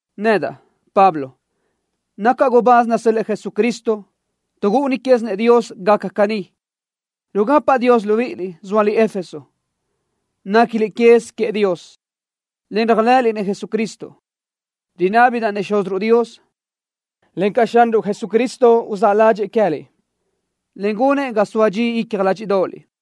Nedaʼ, Pablo, nacaʼ gubáz nasö́l-lëʼë Jesucristo tuʼ gúʼuni quézinëʼ Dios gacaʼ caní. Rugapaʼ Dios libíʼiliʼ, zóaliʼ Éfeso. Néquiliʼ quez queëʼ Dios, en réajlëʼëliʼ Jesucristo. Rinábidaʼ-nëʼ Xúziruʼ Dios, encaʼ Xanruʼ Jesucristo uzáʼ ládxëʼë queë́liʼ, en gunëʼ ga soa dxi icja ládxiʼdoʼoliʼ.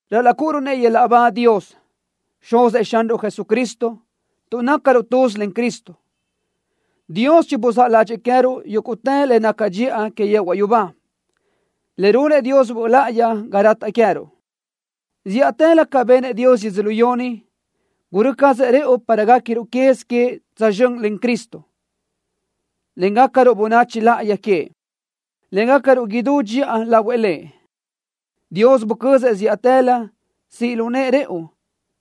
¡Ral-laʼ cúʼuruʼ-nëʼ yöl-laʼ ba Dios, Xuzëʼ Xanruʼ Jesucristo! Tuʼ nácaruʼ tuz len Cristo, Dios chibuzáʼ ládxëʼë queë́ruʼ yúguʼtë le naca dxiʼa que yehuaʼ yubá, le runëʼ Dios Böʼ Láʼayi ga rataʼ queë́ruʼ. Zíʼatëlö ca benëʼ Dios yödzölió ni, gurö́ cazëʼ rëʼu para guéquiruʼ quez queëʼ tsözxö́n len Cristo, en gácaruʼ bönachi láʼayi queëʼ, en gácaruʼ idú dxiʼa lahuëʼ Lëʼ. Dios bucözëʼ zíʼatëlö siʼ lu nëʼë rëʼu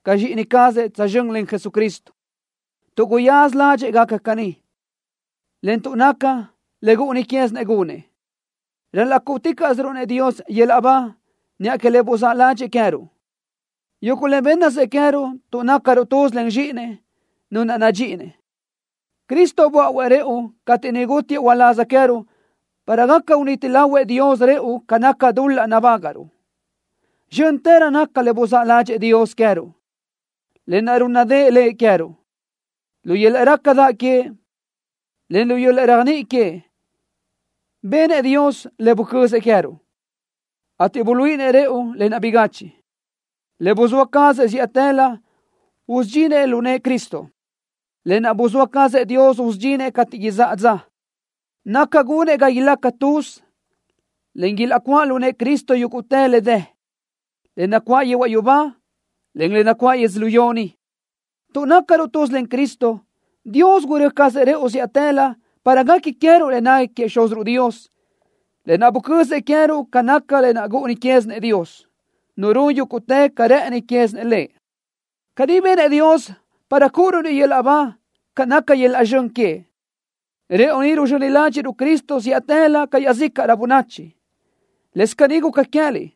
ca zxíʼini cazëʼ tsözxö́n len Jesucristo, tuʼ guyaza ládxëʼë gaca caní, en tuʼ naca le gúʼuni quézinëʼ gunëʼ. ¡Ral-laʼ cúʼuticaʼsiruʼ-nëʼ Dios yöl-laʼ ba niʼa que le buzáʼ ládxëʼë queë́ruʼ, yuguʼ le bénnasëʼ queë́ruʼ tuʼ nácaruʼ tuz len Zxíʼinëʼ, Nu naʼ nadxíʼinëʼ! ¡Cristo böáʼuëʼ rëʼu cateʼ niʼ gútiëʼ uláz queë́ruʼ para gaca uniti lahuëʼ Dios rëʼu ca naca dul-laʼ nabágaʼruʼ! ¡Zxö́ntërö naca le buzáʼ ládxëʼë Dios queë́ruʼ, lë naʼ rúnnadëʼë Lëʼ queë́ruʼ! ¡Lu yöl-laʼ rácadaʼ queëʼ, en lu yöl-laʼ réajniʼi queëʼ benëʼ Dios le bucözëʼ queë́ruʼ, ateʼ buluíʼinëʼ rëʼu lë naʼ bigachiʼ, le buzóa cazëʼ zíʼatëlö usudxinëʼ lu nëʼë Cristo! Lë naʼ buzóa cazëʼ Dios usudxinëʼ cateʼ izáʼa dza, naca gunëʼ ga ilaca tuz, en ilaʼcuáʼ lu nëʼë Cristo yúguʼtë le dë, le nacuáʼ yehuaʼ yubá, en le nacuáʼ yödzölió ni. Tuʼ nácaruʼ tuz len Cristo, Dios gurö́ cazëʼ rëʼu zíʼatëlö para guequi queë́ruʼ le nequi queëʼ Xúziruʼ Dios, lë naʼ bucözëʼ queë́ruʼ ca naca le gúʼuni quézinëʼ Dios, Nu run yúguʼtë ca rë́ʼëni quézinëʼ Lëʼ. Caní benëʼ Dios para cúʼuruʼ-nëʼ yöl-laʼ ba ca naca yöl-laʼ zxön queëʼ, rëʼu ni ruzxöni ládxiʼruʼ-nëʼ Cristo zíʼatëlö ca iaʼzícaʼrö bönachi. Lëscaʼ caní guca queë́liʼ.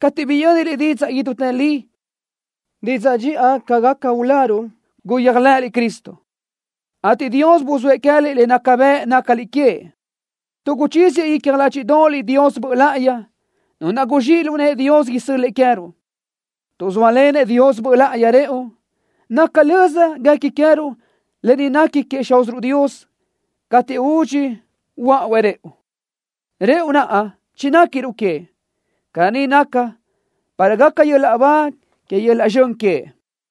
Cateʼ biyö́niliʼ didzaʼ idútë li, didzaʼ dxiʼa ca gaca uláruʼ, guyéajlëʼëliʼ Cristo, ateʼ Dios buzóëʼ queë́liʼ le naca bëʼ nácaliʼ queëʼ, tuʼ guchíziëʼ icja ládxiʼdoʼoliʼ Dios Böʼ Láʼayi, Nu naʼ guzxíʼ lu nëʼë Dios isö́l-lëʼë queë́ruʼ. Tuʼ zóalenëʼ Dios Böʼ Láʼayi rëʼu, naca löza guequi queë́ruʼ le nequi queëʼ Xúziruʼ Dios cateʼ údxi huöáʼuëʼ rëʼu, rëʼu naʼ chinéquiruʼ queëʼ. Caní naca para gaca yöl-laʼ ba que yöl-laʼ zxön queëʼ.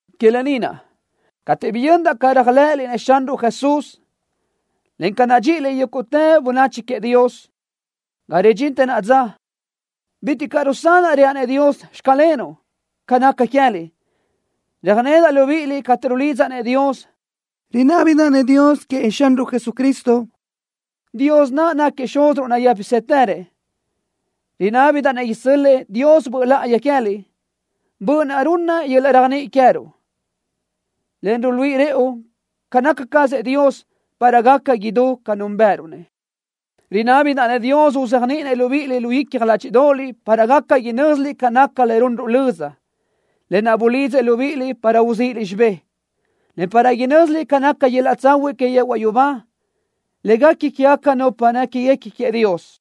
Que lë ni naʼ, cateʼ biyöndaʼ ca réajlëʼëliʼ-nëʼ Xanruʼ Jesús, en ca nadxíʼiliʼ yúguʼtë bönachi queëʼ Dios, ga ridxintë naʼa dza bitiʼ caʼ rusanaʼ reaʼ-nëʼ Dios: “Xclenuʼ”, ca naca queë́liʼ. Röjnedaʼ libíʼiliʼ cateʼ rulidzaʼ-nëʼ Dios. Rinábidaʼ-nëʼ Dios queëʼ Xanruʼ Jesucristo, Dios naʼ náquiëʼ Xúziruʼ nayë́pisëtërëʼ, rinábidaʼ-nëʼ isö́l-lëʼë Dios Böʼ Láʼayi queë́liʼ, Böʼ naʼ runna yöl-laʼ réajniʼi queë́ruʼ, en ruluíʼi rëʼu ca naca cazëʼ Dios, para gaca idú ca núnbëʼëruʼ-nëʼ. Rinábidaʼ-nëʼ Dios uzéajniʼinëʼ libíʼiliʼ lu icja ládxiʼdoʼoliʼ para gaca inö́ziliʼ ca naca le runruʼ löza, lë naʼ bulidzëʼ libíʼiliʼ para uzíʼiliʼ xibé, en para inö́ziliʼ ca naca yöl-laʼ tsahuiʼ que yehuaʼ yubá, le guequi quégaca nupa néquiguequi queëʼ Dios,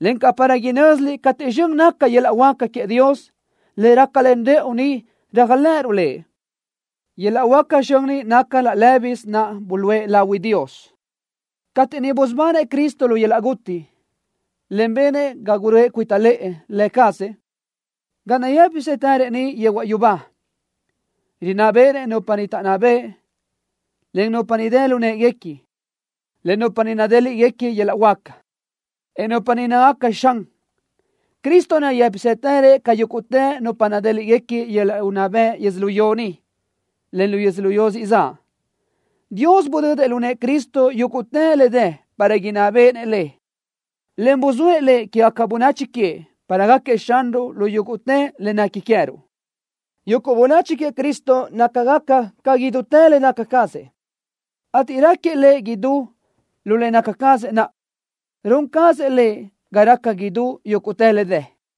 encaʼ para inö́ziliʼ cateʼ zxön naca yöl-laʼ huáca queëʼ, le rácalen rëʼu ni réajlëʼëruʼ Lëʼ. Yöl-laʼ huáca zxön ni naca laʼ lë́bisö naʼ buluʼe lahui Dios cateʼ niʼ busubanëʼ Cristo lu yöl-laʼ guti, en benëʼ ga guröʼë cuita lëʼë Lë cazëʼ ga nayë́pisëtërëʼ niʼ yehuaʼ yubá. Rinná béʼenëʼ nupa niʼ taʼnná bëʼ, en nupa niʼ dë lu në́ʼeguequi, en nupa niʼ nadéliʼgaca yöl-laʼ huáca, en nupa niʼ nácagaca xan. Cristo nayë́pisëtërëʼ ca yúguʼtë nupa nadéliʼgaca yöl-laʼ unná bëʼ yödzölió ni, en lu yödzölió siʼ zaʼ. Dios budödëʼ lu nëʼë Cristo yúguʼtë le dë para inná béʼenëʼ le, en buzóëʼ Lëʼ quégaca bönachi queëʼ para gáquiëʼ Xanruʼ lu yúguʼtë le nequi queë́ruʼ. Yuguʼ bönachi queëʼ Cristo nácagaca ca idútë le naca cazëʼ, ateʼ raquiëʼ Lëʼ idú lu le naca cazëʼ naʼ. Run cazëʼ Lëʼ ga raca idú yúguʼtë le dë.